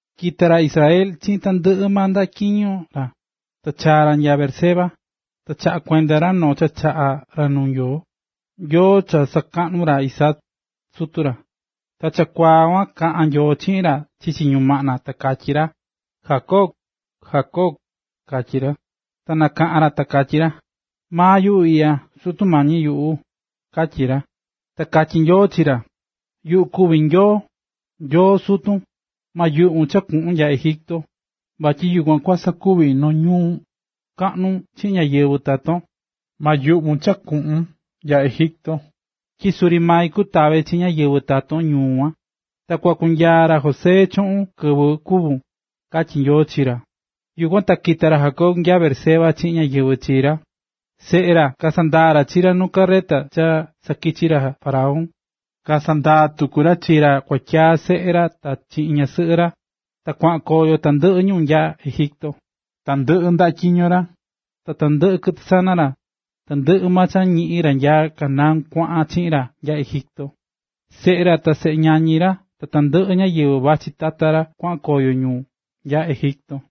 Kita̱ ra Israela chiꞌin tandɨꞌɨ maa ndaꞌa tyiño ra. Ta chaa̱ ra nya Beerseba, ta chaꞌa̱ kuenda ra noo cha chaꞌa̱ ra nuu Nyoo, Nyoo cha sakaꞌnu̱ ra Isaac, sutu ra. Ta chakuaa kuan kaꞌa̱n Nyoo chiꞌin ra chichi ñumaꞌna ta katyí ra: ―Jacob, Jacob ―katyí ra. Ta nakaꞌán ra ta katyí ra: ―Maa yuꞌu iꞌya, Sutu mañi yuꞌu ―katyí ra. Ta katyí Nyoo chi ra: ―Yuꞌu kuví Nyoo, Nyoo sutun. Ma yuꞌvun cha kuꞌun nya Egipto, vatyi yukuan kua sakuvi noo ñuu kaꞌnu chiꞌin ñáyɨvɨ taton. Ma yuꞌvun cha kuꞌun nya Egipto, tyi suri mai kutava chi ñáyɨvɨ taton ñuu kuan. Ta kua kunyaa ra José chuꞌun kɨvɨ kúvun ―katyí Nyoo chi ra. Yukuan ta kita̱ ra Jacob nya Beerseba chiꞌin ñáyɨvɨ chi ra. Seꞌe ra kasandaa̱ ra chi ra nu carreta cha sakichi̱ ra faraón, kasandaa̱ tuku ra chi ra kuatyaa seꞌe ra ta chiꞌin ñasɨꞌɨ ra, ta kuaꞌan koyo tandɨꞌɨ ñu nya Egipto. Tandɨꞌɨ ndaꞌa tyiño ra, ta tandɨꞌɨ kɨtɨ sana ra, tandɨꞌɨ maa cha ñiꞌi̱n ra nya Canaán kuaꞌan chiꞌin ra nya Egipto. Seꞌe ra ta seꞌe ñañi ra ta tandɨꞌɨ ñáyɨvɨ vachí tata ra kuaꞌan koyo ñu nya Egipto.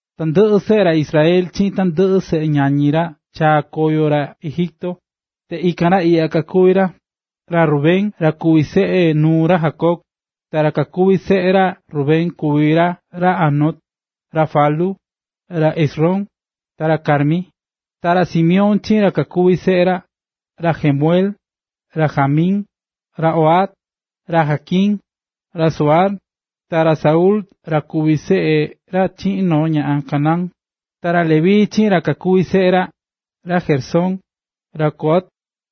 Tandɨꞌɨ seꞌe ra Israel chiꞌin tandɨꞌɨ seꞌe ñañi ra chaa̱ koyo ra Egipto. Ta ikan ra iꞌya kakuví ra: Ra Rubén ra kuví seꞌe nuu ra Jacob. Ta ra kakuví seꞌe ra Rubén kuví ra ra Hanoc, ra Falú, ra Hezrón ta ra Carmi. Ta ra Simeón chiꞌin ra kakuví seꞌe ra: ra Jemuel, ra Jamín, ra Ohad, ra Jaquín, ra Zohar, ta ra Saúl ra kuví seꞌe ra chiꞌin noo ñaꞌan Canaán. Ta ra Leví chiꞌin ra kakuví seꞌe ra: ra Gersón, ra Coat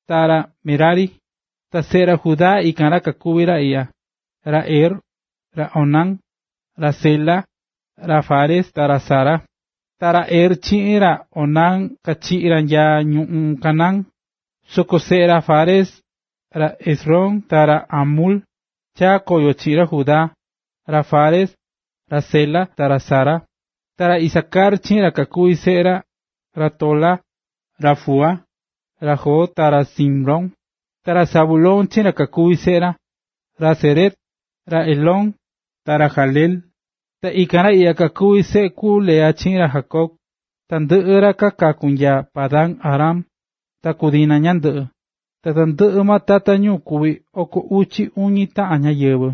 ta ra Merari. Ta seꞌe ra Judá ikan kakuví ra iꞌya: ra Er, ra Onán, ra Sela, ra Fares ta ra Zara. Ta ra Er chiꞌin ra Onán kachiꞌi̱ ra nya ñuꞌún Canaán. Soko seꞌe ra Fares: ra Hezrón ta ra Hamul, chaa̱ koyo chiꞌin ra Judá, ra Fares, ra Sela ta ra Zara. Ta ra Isacar chiꞌin ra kakuví seꞌe ra: ra Tola, ra Fúa, ra Job ta ra Simrón. Ta ra Zabulón chiꞌin ra kakuví seꞌe ra: ra Sered, ra Elón ta ra Jahleel. Ta ikan ra iꞌya kakuví seꞌe ku Lea chiꞌin ra Jacob, tandɨꞌɨ ra kaku̱ nya Padan-aram, ta ku Dina ñandɨꞌɨ. Ta tandɨꞌɨ tata ñu kuví oko uchi uñi taꞌan ñáyɨvɨ.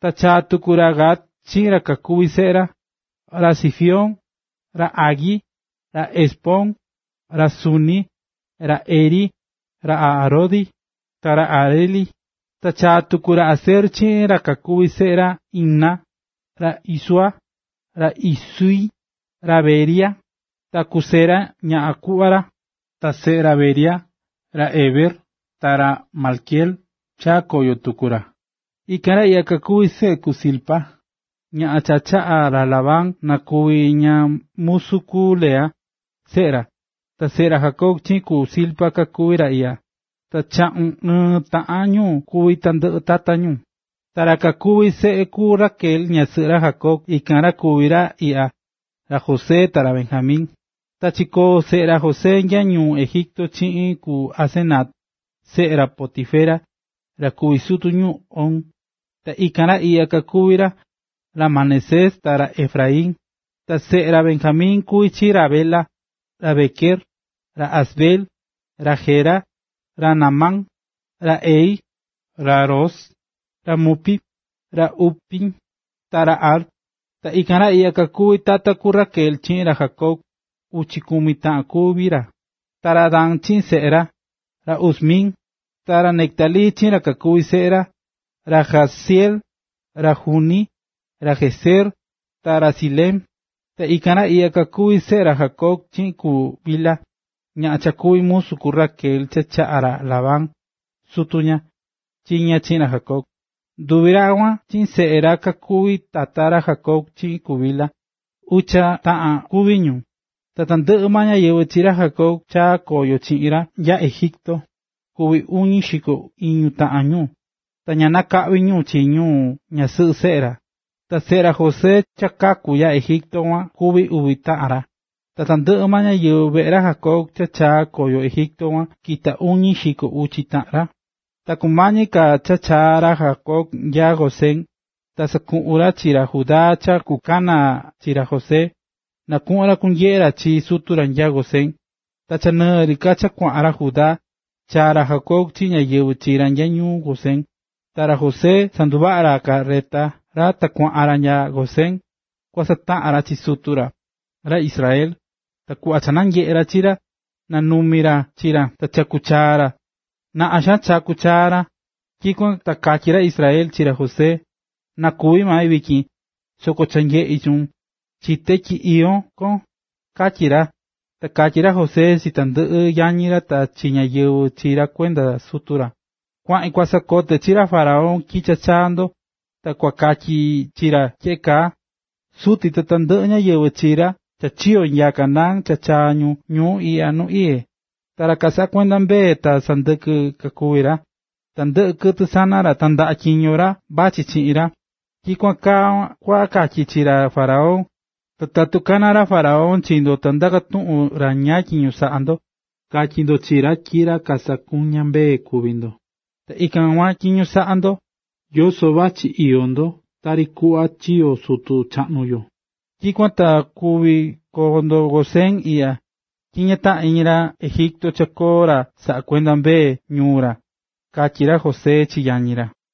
Ta chaa̱ tuku ra Gad chiꞌin ra kakuví seꞌe ra: ra Zifión, ra Hagui, ra Ezbón, ra Suni, ra Eri, ra Arodi, ta ra Areli. Ta chaa̱ tuku ra Aser chiꞌin ra kakuví seꞌe ra: ra Imna, ra Isúa, ra Isúi, ra Beria, ta ku Sera ñaꞌan kuꞌva ra. Ta seꞌe ra Beria: ra Heber ta ra Malquiel chaa̱ koyo tuku ra. Ikan ra iꞌya kakuví seꞌe ku Zilpa, ñaꞌan cha chaꞌa̱ ra Labán na kuvi ña musu ku Lea, seꞌe ra; ta seꞌe ra Jacob chiꞌin ku Zilpa kakuví ra iꞌya. Ta chaꞌun ɨɨn taꞌan ñu kuví tandɨꞌɨ tata ñu. Ta ra kakuví seꞌe ku Raquel ñasɨꞌɨ ra Jacob ikan kuví ra iꞌya: ra José ta ra Benjamin. Ta chikóo seꞌe ra José nya ñuu Egipto chiꞌin ku Asenat, seꞌe ra Potifera, ra kuví sutu ñuu On, ta ikan ra iꞌya kakuví ra: ra Manasés ta ra Efraín. Ta seꞌe ra Benjamin kuvi chi ra Bela, ra Bequer, ra Asbel, ra Gera, ra Naamán, ra Ehi, ra Ros, ra Mupim, ra Hupim, ta ra Ard. Ta ikan ra iꞌya kakuvi̱ tata ku Raquel chiꞌin ra Jacob, uchi kumi taꞌan kuví ra. Ta ra Dan chiꞌin seꞌe ra: ra Husim. Ta ra Neftalí chiꞌin ra kakuví seꞌe ra: ra Jahzeel, ra Guni, ra Jezer ta ra Silem. Ta ikan ra iꞌya kakuví seꞌe ra Jacob chiꞌin ku Bilha, ñaꞌan cha kuví musu ku Raquel cha chaꞌa̱ ra Labán, sutu ña, chi ña chi ra Jacob. Nduvi ra kuan chiꞌin seꞌe ra kakuvi̱ tata ra Jacob chiꞌin ku Bilha, ucha taꞌan kuví ñu. Ta tandɨꞌɨ ñáyɨvɨ chi ra Jacob cha chaa̱ koyo chiꞌin ra nya Egipto, kuví uñi xiko iñu taꞌan ñu, ta ña nakaꞌvi ñu chi ñu ñasɨꞌɨ seꞌe ra. Ta seꞌe ra José cha kaku̱ Egipto kuan kuví uvi taꞌan ra. Ta tandɨꞌɨ ñáyɨvɨ veꞌe ra Jacob cha chaa̱ koyo Egipto kuan kita̱ uñi xiko uchi taꞌan ra. Ta kumañi ka cha chaa ra Jacob nya Gosén, ta sakuꞌu̱n ra chi ra Judá cha kukana chi ra José, na kuꞌun ra kunyeꞌe ra chi sutu ra nya Gosén. Ta cha nɨɨ ri ka cha kuaꞌan ra Judá, ta chaa̱ ra Jacob chiꞌin ñáyɨvɨ chi ra ñuꞌún Gosén. Ta ra José sanduvaꞌa̱ ra carreta ra ta kuaꞌan ra nya Gosén, kua sataꞌan ra chi sutu ra, ra Israel. Ta kuꞌva cha nanyeꞌé ra chi ra, nanumi̱ ra chi ra ta chaku̱ chaa ra, naꞌan xaan chaku̱ chaa ra. Tyikuan ta katyí ra Israel chi ra José: ―Na kúvi mai vityin, soko cha nyeꞌí chuun, chité tyi iyó kon ―katyí ra. Ta katyí ra José chi tandɨꞌɨ yañi ra ta chi ñáyɨvɨ chi ra kuenda sutu ra: ―Kuaꞌin kua sakote chi ra faraón tyi cha chaa̱ ndo. Ta kua katyi chi ra tyeꞌe kaa: “Suti ta tandɨꞌɨ ñáyɨvɨ chi ra cha chiyo̱ nya Canaán cha chaa̱ ñu ñuu iꞌya nu iyé. Ta ra kasaꞌá kuenda mbee ta sandɨkɨ kakuví ra. Tandɨꞌɨ kɨtɨ sana ra ta ndaꞌa tyiño ra vachí chiꞌin ra.” Tyikuan kaa kua katyi chi ra faraón, ta tatu kana ra faraón chi ndo ta ndaka tuꞌun ra ñáá tyiño saꞌá ndo, ka̱tyi ndo chi ra tyi ra sakuñá mbee kuví ndo, ta ikan kuan tyiño saꞌá ndo, yoso vachí iyó ndo tari kuꞌva chiyo̱ sutu chaꞌnu yo. Tyikuan ta kuvi koo ndo Gosén iꞌya, tyi ña taꞌán iñi ra Egipto cha koo ra saꞌakuendá mbee ñuu ra ―katyi ra José chi yañi ra.